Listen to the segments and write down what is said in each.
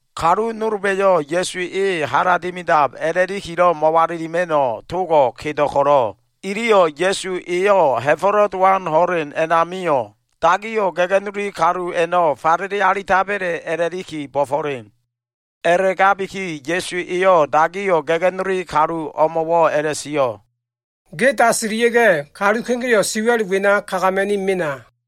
Kalu nolba꞉yo꞉ Ya꞉su e hala dimidab a꞉la꞉likilo꞉ mo꞉walilima꞉no꞉ togo꞉ kedo꞉ ko꞉lo꞉, iliyo꞉ Ya꞉su eyo꞉ Ha꞉fo꞉lo꞉ Dowan ho꞉len a꞉namio꞉ dagiyo꞉ ga꞉ga꞉nuli kalu a꞉no꞉ falele alitaba꞉le a꞉la꞉liki bo꞉fo꞉len. A꞉la꞉gabiki Ya꞉su eyo꞉ dagiyo꞉ ga꞉ga꞉nuli kalumo꞉wo꞉ a꞉la꞉sio꞉, “Ge dasilia꞉ga꞉, kalu kegeo꞉ siwa꞉l wena kagama꞉ni mena.”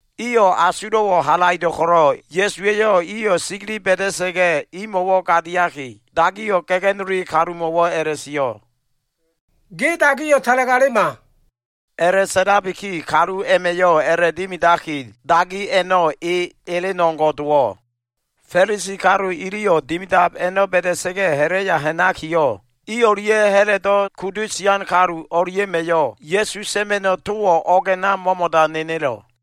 Iyo꞉ asulo꞉wo꞉ halaido꞉ ko꞉lo꞉, Ya꞉suwa꞉yo꞉ iyo꞉ sigili ba꞉da꞉sa꞉ga꞉ imo꞉wo꞉ gadiaki, dagiyo꞉ ga꞉ga꞉nuli kalumo꞉wo꞉ a꞉la꞉sio꞉, “Ge dagiyo꞉ talagalema.” A꞉la꞉sa꞉labiki kalu a꞉ma꞉yo꞉ a꞉la꞉dimidaki, dagi a꞉no꞉ e elen o꞉ngo꞉ dowo꞉. Fa꞉lisi kalu iliyo꞉ dimidab a꞉no꞉ ba꞉da꞉sa꞉ga꞉, ha꞉la꞉ya ha꞉nakiyo꞉, i o꞉lia꞉ Ha꞉lodo꞉ kudu sian kalu o꞉lia꞉ma꞉yo꞉ Ya꞉su sa꞉ma꞉no꞉ towo꞉ o꞉g a꞉na mo꞉mo꞉da nenelo꞉.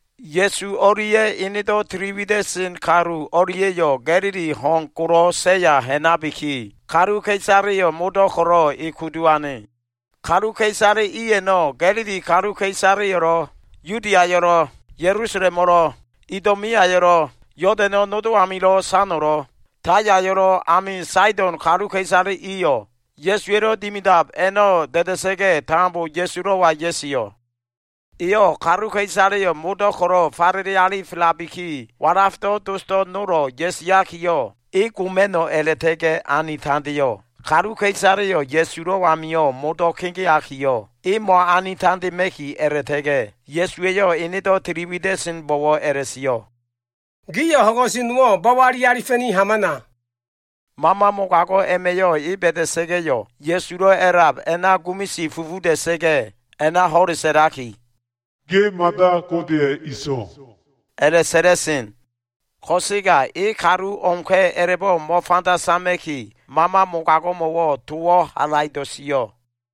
Ya꞉su o꞉lia꞉ enedo꞉ tili wida꞉sen kalu o꞉lia꞉yo꞉ Ga꞉lili ho꞉n golo꞉ seya ha꞉nabiki, kaluka꞉isaleyo꞉ modo꞉ ko꞉lo꞉ e kudu ane. Kaluka꞉isale i a꞉no꞉ Ga꞉lili kaluka꞉isaleyo꞉lo꞉, Yudiayo꞉lo꞉, Ya꞉lusalemo꞉lo꞉, Idomeayo꞉lo꞉, Yodano꞉ nodo amilo꞉ sano꞉lo꞉, Tayayo꞉lo꞉ ami Saido꞉n kaluka꞉isale iyo꞉ Ya꞉suwa꞉lo꞉ dimidab a꞉no꞉ da꞉da꞉sa꞉ga꞉, tambo Ya꞉sulo꞉wa ya꞉sio꞉. Eyo꞉ kaluka꞉isaleyo꞉ modo꞉ ko꞉lo꞉ falele alifelabiki, walafdo꞉ dosdo꞉ nolo꞉ ya꞉siakiyo꞉, e goma꞉no꞉ a꞉la꞉ta꞉ga꞉ ani tandeo꞉. Kaluka꞉isaleyo꞉ Ya꞉sulo꞉ amio꞉ modo꞉ kegeakiyo꞉, e mo꞉ani tandema꞉ki a꞉la꞉ta꞉ga꞉ Ya꞉suwa꞉yo꞉ enedo꞉ tili wida꞉senbo꞉wo꞉ a꞉la꞉sio꞉, “Gio꞉ ho꞉n ko꞉su nowo꞉ bo꞉bo꞉li alifa꞉ni hamana.” Mama mogago꞉ a꞉ma꞉yo꞉ e ba꞉da꞉sa꞉ga꞉yo꞉, Ya꞉sulo꞉ a꞉lab a꞉na gumisi fufuda꞉sa꞉ga꞉ a꞉na ho꞉le sa꞉laki, “Ge mada Godeya꞉ ene So꞉wa” a꞉la꞉sa꞉la꞉sen. Ko꞉sega e kalu o꞉mka꞉ a꞉la꞉bo꞉ mo꞉fanda sama꞉kiyo꞉, mama mogago꞉mo꞉wo꞉ towo꞉ halaido꞉ sio꞉.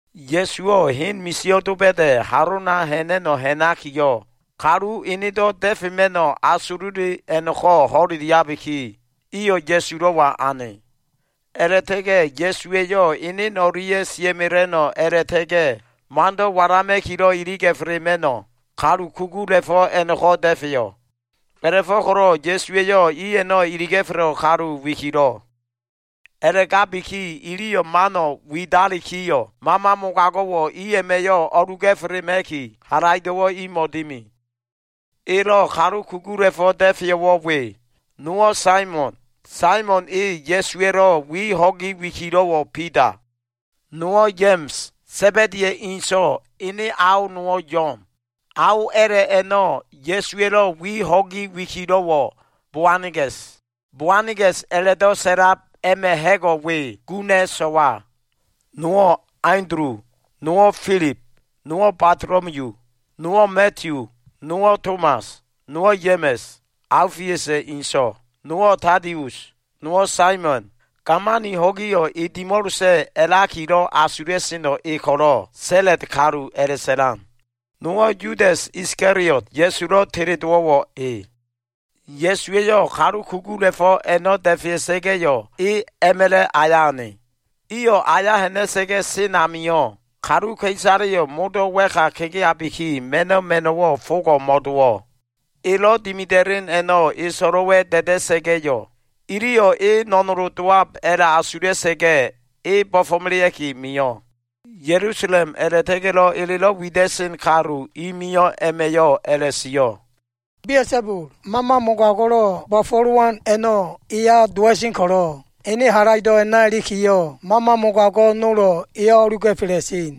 Ya꞉suwo꞉ hen misio꞉ doba꞉da꞉ halona ha꞉na꞉no꞉ ha꞉nakiyo꞉, kalu enedo꞉ da꞉fema꞉no꞉ asulo꞉le a꞉no꞉ko꞉ ho꞉leliabiki, iyo꞉ Ya꞉sulo꞉wa ane. A꞉la꞉ta꞉ga꞉ Ya꞉suwa꞉yo꞉ enen o꞉lia꞉ sia꞉mela꞉no꞉ a꞉la꞉ta꞉ga꞉ mando꞉ walama꞉kilo꞉ iliga꞉felema꞉no꞉, kalu kugula꞉fo꞉ a꞉no꞉ko꞉ da꞉feyo꞉. A꞉la꞉fo꞉ko꞉lo꞉ Ya꞉suwa꞉yo꞉ i a꞉no꞉ iliga꞉felo꞉ kalu wikilo꞉. A꞉la꞉gabiki iliyo꞉ mano꞉ widalikiyo꞉, mama mogago꞉wo꞉ i a꞉ma꞉yo꞉ o꞉luga꞉felema꞉ki, halaido꞉wo꞉ imo꞉ dimi. Elo꞉ kalu kugula꞉fo꞉ da꞉feyo꞉wo꞉ we. Nowo꞉ Saimon, Saimon e Ya꞉suwa꞉lo꞉ wi ho꞉gi wikilo꞉wo꞉ Bida. Nowo꞉ Ya꞉ma꞉s, Sa꞉ba꞉diya꞉ inso꞉, ene ao nowo꞉ Yo꞉n. Ao a꞉la꞉ a꞉no꞉ Ya꞉suwa꞉lo꞉ wi ho꞉gi wikilo꞉wo꞉ Boana꞉ga꞉s. Boana꞉ga꞉s a꞉la꞉do꞉ sa꞉lab a꞉ma꞉ ha꞉go꞉ we, guna꞉ so꞉wa. Nowo꞉ Andulu, nowo꞉ Filib, nowo꞉ Batolomiyu, nowo꞉ Madiyu, nowo꞉ Tomas, nowo꞉ Ya꞉ma꞉s, Aofiusa꞉ inso꞉, nowo꞉ Tadius, nowo꞉ Saimon, gamani ho꞉giyo꞉ e dimo꞉losa꞉ a꞉lakilo꞉ asula꞉seno꞉ e ko꞉lo꞉, Sa꞉la꞉t kalu a꞉la꞉sa꞉lan, Nowo꞉ Yudas Iskaliot, Ya꞉sulo꞉ teledowo꞉wo꞉ e. Ya꞉suwa꞉yo꞉ kalu kugula꞉fo꞉ a꞉no꞉ da꞉fea꞉sa꞉ga꞉yo꞉, e a꞉ma꞉la꞉ aya ane. Iyo꞉ aya ha꞉na꞉sa꞉ga꞉ sen amio꞉, kaluka꞉isaleyo꞉ modo꞉ wa꞉ka kegeabiki, ma꞉no꞉ ma꞉no꞉wo꞉ fogo꞉ mo꞉dowo꞉. Elo꞉ dimida꞉len a꞉no꞉ e so꞉lo꞉wa꞉ da꞉da꞉sa꞉ga꞉yo꞉, iliyo꞉ e no꞉nolo꞉ dowab a꞉la꞉asula꞉sa꞉ga꞉, e bo꞉fo꞉melea꞉ki mio꞉. Ya꞉lusalem a꞉la꞉ta꞉ga꞉lo꞉ elelo꞉ wida꞉sen kalu i mio꞉ a꞉ma꞉yo꞉ a꞉la꞉sio꞉, “Bia꞉sabul, mama mogago꞉lo꞉ bo꞉fo꞉lowan a꞉no꞉ eya dowa꞉sen ko꞉lo꞉, ene halaido꞉ a꞉na ilikiyo꞉ mama mogago꞉ nolo꞉ eyo꞉ o꞉luga꞉fela꞉sen.”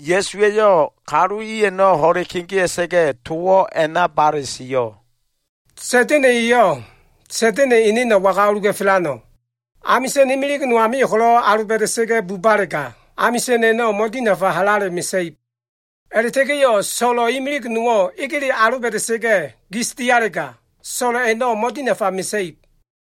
Ya꞉su eyo꞉ kalu i a꞉no꞉ ho꞉le kegea꞉sa꞉ga꞉, towo꞉ a꞉na bale sio꞉, “Sa꞉da꞉na꞉ eyo꞉, Sa꞉da꞉na꞉ eneno꞉ waga o꞉luga꞉felano꞉? Amisa꞉n imilig no amio꞉ ko꞉lo꞉ aloba꞉da꞉sa꞉ga꞉ bubalega, amisa꞉n a꞉no꞉ mo꞉dinafa halale mesa꞉ib. A꞉la꞉ta꞉ga꞉yo꞉ so꞉lo꞉ imilig nowo꞉ egele aloba꞉da꞉sa꞉ga꞉ gis dialega, so꞉lo꞉ a꞉no꞉ mo꞉dinafa mesa꞉ib.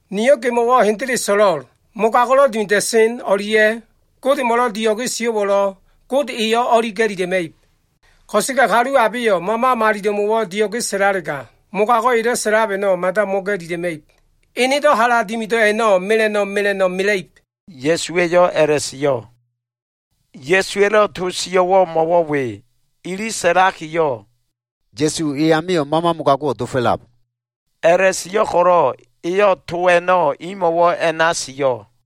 “Niyo꞉ gemo꞉wo꞉ hendele so꞉lo꞉l. Mogago꞉lo꞉ dimida꞉sen o꞉lia꞉ Godemo꞉lo꞉ dio꞉ge sio꞉wo꞉lo꞉, Gode eyo꞉ o꞉li ga꞉lila꞉ma꞉ib. Ko꞉sega kalu abeyo꞉ Mama Malilo꞉mo꞉wo꞉ dio꞉ge sa꞉lalega, mogago꞉ elo꞉ sa꞉lab a꞉no꞉ mada mo꞉ga꞉lila꞉ma꞉ib. Enedo꞉ hala dimido꞉ a꞉no꞉ mela꞉no꞉ mela꞉no꞉ mela꞉ib,” Ya꞉suwa꞉yo꞉ a꞉la꞉sio꞉. Ya꞉suwa꞉lo꞉ to sio꞉ a꞉no꞉ mo꞉wo꞉ we. Ili sa꞉lakiyo꞉, “Ya꞉su e amio꞉ mama mogago꞉wo꞉ dofo꞉lab,” a꞉la꞉sio꞉ ko꞉lo꞉ eyo꞉ to a꞉no꞉ imo꞉wo꞉ a꞉na sio꞉.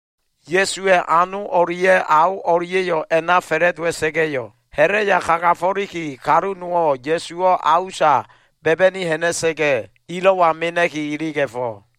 Ya꞉suwa꞉ ano o꞉lia꞉ ao o꞉lia꞉yo꞉ a꞉na fa꞉la꞉dowa꞉sa꞉ga꞉yo꞉, ha꞉la꞉ya kagafo꞉liki, kalu nowo꞉ Ya꞉suwo꞉ a usa ba꞉ba꞉ni ha꞉na꞉sa꞉ga꞉, ilo꞉wa mena꞉ki iliga꞉fo꞉.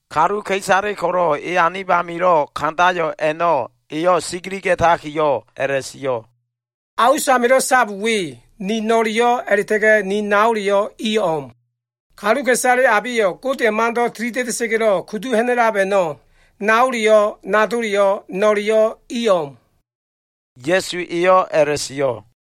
Kaluka꞉isale ko꞉lo꞉ e anib amilo꞉ kandayo꞉ a꞉no꞉ eyo꞉ sigiliga꞉takiyo꞉ a꞉la꞉sio꞉, “A us amilo꞉ sab we ni no꞉leyo꞉ a꞉la꞉ta꞉ga꞉ ni naoleyo꞉ i o꞉m. Kaluka꞉isale abeyo꞉ Godeya꞉ mando꞉ tilida꞉da꞉sa꞉ga꞉lo꞉ kudu ha꞉na꞉lab a꞉no꞉, naoleyo꞉ nadoleyo꞉ no꞉leyo꞉ i o꞉m,” Ya꞉su eyo꞉ a꞉la꞉sio꞉.